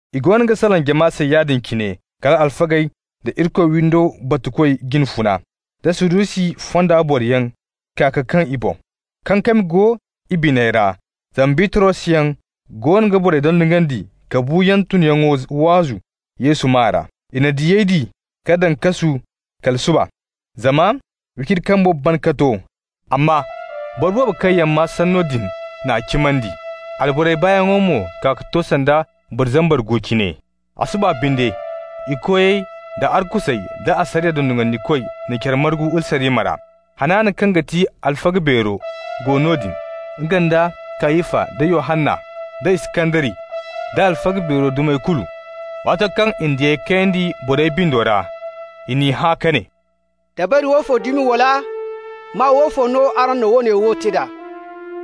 I goono ga salaŋ jama se yaadin cine, kal alfagey da Irikoy windo batukoy jine funa, da Sadusi fonda boroyaŋ kaa ka kaŋ i boŋ. Kankami go i biney ra, zama Bitrosyaŋ goono ga borey dondonandi ka buuyaŋ tunyaŋo waazu Yesu maa ra. I na diyey di ka daŋ kasu kala suba, zama wiciri kambo ban ka to. Amma boro boobo kaŋ yaŋ maa sanno din n'a cimandi, alborey baayaŋo mo kaa ka to sanda boro zambar gu cine. A suba binde, i koyey da arkusey da asariya dondonandikoy na care margu Urusalima ra. Hanana kaŋ ga ti alfaga beero go noodin, nga nda Kayafa, da Yohanna, da Iskandari, da alfaga beero dumey kulu. Waato kaŋ i na diyey kayandi borey bindo ra, i n'i hã ka ne: «Dabari woofo dumi wala maa woofo no araŋ na woone wo te d'a?»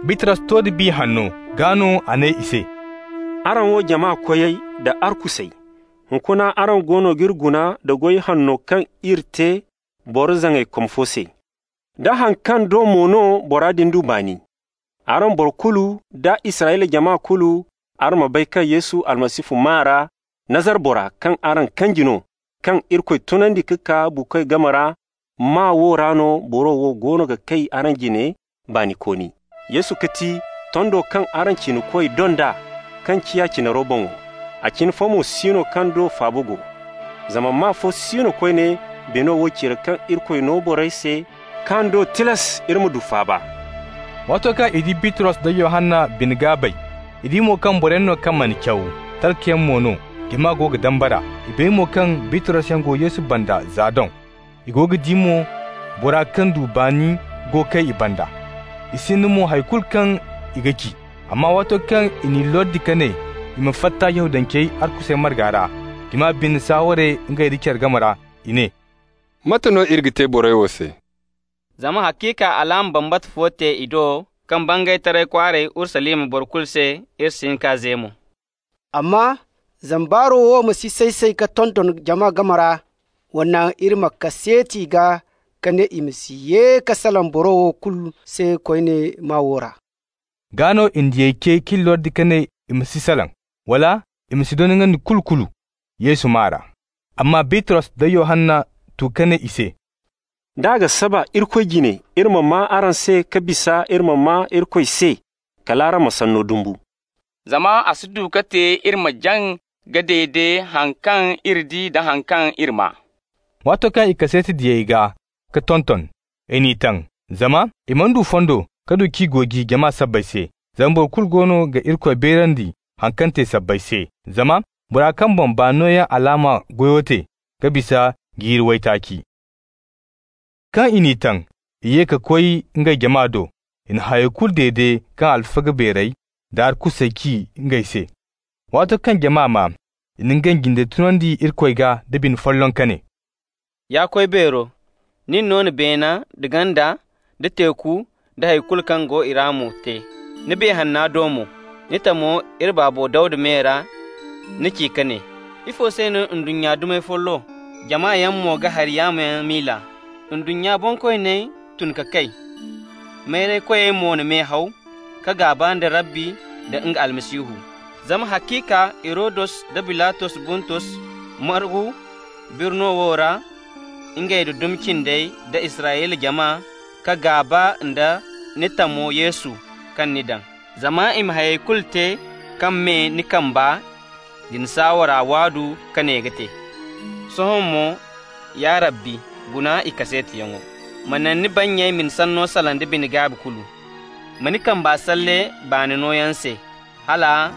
Bitros to da Biya Hanno. Gaa no a ne i se: «Araŋ wo jama koyey da arkusey, hunkuna araŋ goono g'iri guna nda goy hanno kaŋ iri te boro zaŋaykom fo se, da haŋ kaŋ do mo no bora din du baani. Araŋ boro kulu da Israyla jama kulu, araŋ ma bay kaŋ Yesu Almasihu maa ra, Nazara bora kaŋ araŋ kanji no, kaŋ Irikoy tunandi ka kaa buukoy game ra -- maa wo ra no boro wo goono ga kay araŋ jine baanikooni. Yesu ga ti: ‹tondo kaŋ araŋ cinakoy donda, kaŋ ciya cinaro boŋo.› A cine fo mo si no kaŋ do faaba go, zama maa fo si no koyne beeno wo cire kaŋ Irikoy no borey se kaŋ do tilas iri ma du faaba.» Waato kaŋ i di Bitros da Yohanna bine-gaabey, i di mo kaŋ boroyaŋ no kaŋ mana caw, talkayaŋ mo no, jama go ga dambara. I bay mo kaŋ Bitrosyaŋ go Yesu banda za doŋ. I go ga di mo bora kaŋ du baani go ga kay i banda, i sinda mo hay kulu kaŋ i ga ci. Amma waato kaŋ i n'i lordi ka ne i ma fatta Yahudancey arkusey marga ra, jama binde saaware ngey nda care game ra. I ne: «Mate no iri ga te borey wo se? Zama haciika alaama bambata fo te i do kaŋ bangay taray kwaaray Urusalima boro kulu se. Iri si hin k'a ze mo. Amma zama baaro wo ma si say-say ka tonton jama game ra, wa naŋ iri ma kaseeti i gaa ka ne i ma si ye ka salaŋ boro kulu se koyne maa wo ra.» Gaa no i na diyey ce k'i lordi ka ne i ma si salaŋ, wala i ma si dondonandi kulu-kulu Yesu maa ra. Amma Bitros da Yohanna tu ka ne i se: «D'a ga saba Irikoy jine iri ma maa araŋ se ka bisa iri ma maa Irikoy se, kal araŋ ma sanno dumbu. Zama a si du ka te iri ma jaŋ ka dede haŋ kaŋ iri di da haŋ kaŋ iri maa.» Waato kaŋ i kaseeti diyey gaa ka tonton, i n'i taŋ, zama i mana du fondo ka du k'i gooji jama sabbay se. Zama boro kulu goono ga Irikoy beerandi haŋ kaŋ te sabbay se. Zama bora kaŋ boŋ baani nooyaŋ alaama goyo te ga bisa jiiri waytaaci. Kaŋ i n'i taŋ, i ye ka koy ngey jama do. I na hayey kulu dede kaŋ alfaga beerey da arkusey ci ngey se. Waato kaŋ jama maa, i na ngey jindey tunandi Irikoy gaa da bine folloŋ ka ne: «Ya Koy Beero, nin no na beene nda ganda, da teeku, da hay kulu kaŋ go i ra mo te. Ni Biya Hanna do mo, ni tamo iri baabo Dawda me ra, ni ci ka ne: ‹Ifo se no ndunnya dumey follo, jamayaŋ mo ga hari yaamo yaŋ miila? Ndunnya bonkooney tun ka kay, mayraykoyey mo na me haw ka gaaba nda Rabbi nda nga Almasihu.› Zama haciika Hirodus da Bilatos Buntus margu birno wo ra, ngey nda dumi cindey da Israyla jama, ka gaaba nda ni tamo Yesu kaŋ ni daŋ. Zama i ma hayey kulu te kaŋ me ni kamba da ni saawara waadu ka ne ga te. Sohõ mo, ya Rabbi, guna i kaseetiyaŋo. Ma naŋ ni bannyey ma ni sanno salaŋ da bine-gaabi kulu. Ma ni kamba salle baani nooyaŋ se, hala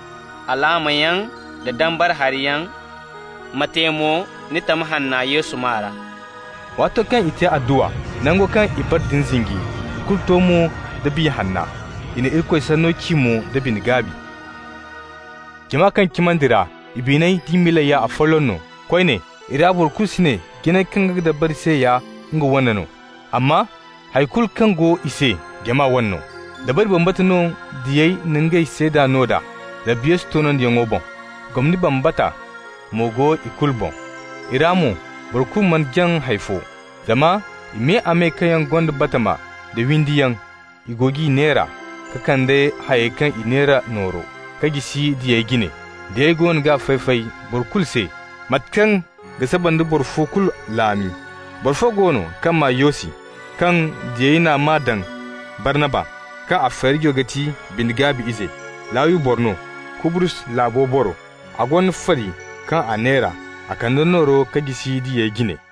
alaamayaŋ da dambara hariyaŋ ma te mo ni tam hanna Yesu maa ra.» Waato kaŋ i te adduwa, nango kaŋ i bara din zinji. I kulu to mo da Biya Hanna, i na Irikoy sanno ci mo da bine-gaabi. Jama kaŋ cimandi ra, i biney d'i miiley ya afolloŋ no. Koyne i ra boro kulu si ne jinay kaŋ nga ga dabari se ya nga wane no, amma hay kulu kaŋ go i se jama wane no. Dabari bambata no diyey na ngey seeda no d'a, Rabbi Yesu tunyaŋo boŋ. Gomni bambata mo go i kulu boŋ. I ra mo boro kulu mana jaŋ hay fo, zama i me-a-me kaŋ yaŋ gonda batama da windi yaŋ, i go g'i neera, ka kande hayey kaŋ i neera nooro k'a jisi diyey jine. Diyey goono g'a fay-fay boro fo kulu se, mate kaŋ ga saba nda boro fo kulu laami. Boro fo go no kaŋ maa Yosi, kaŋ diyey n'a maa daŋ Barnaba (kaŋ a feerijo ga ti Bine-gaabi Ize). Lawi boro no, Kubrus laabo boro. A gonda fari kaŋ a neera. A kande nooro ka jisi diyey jine.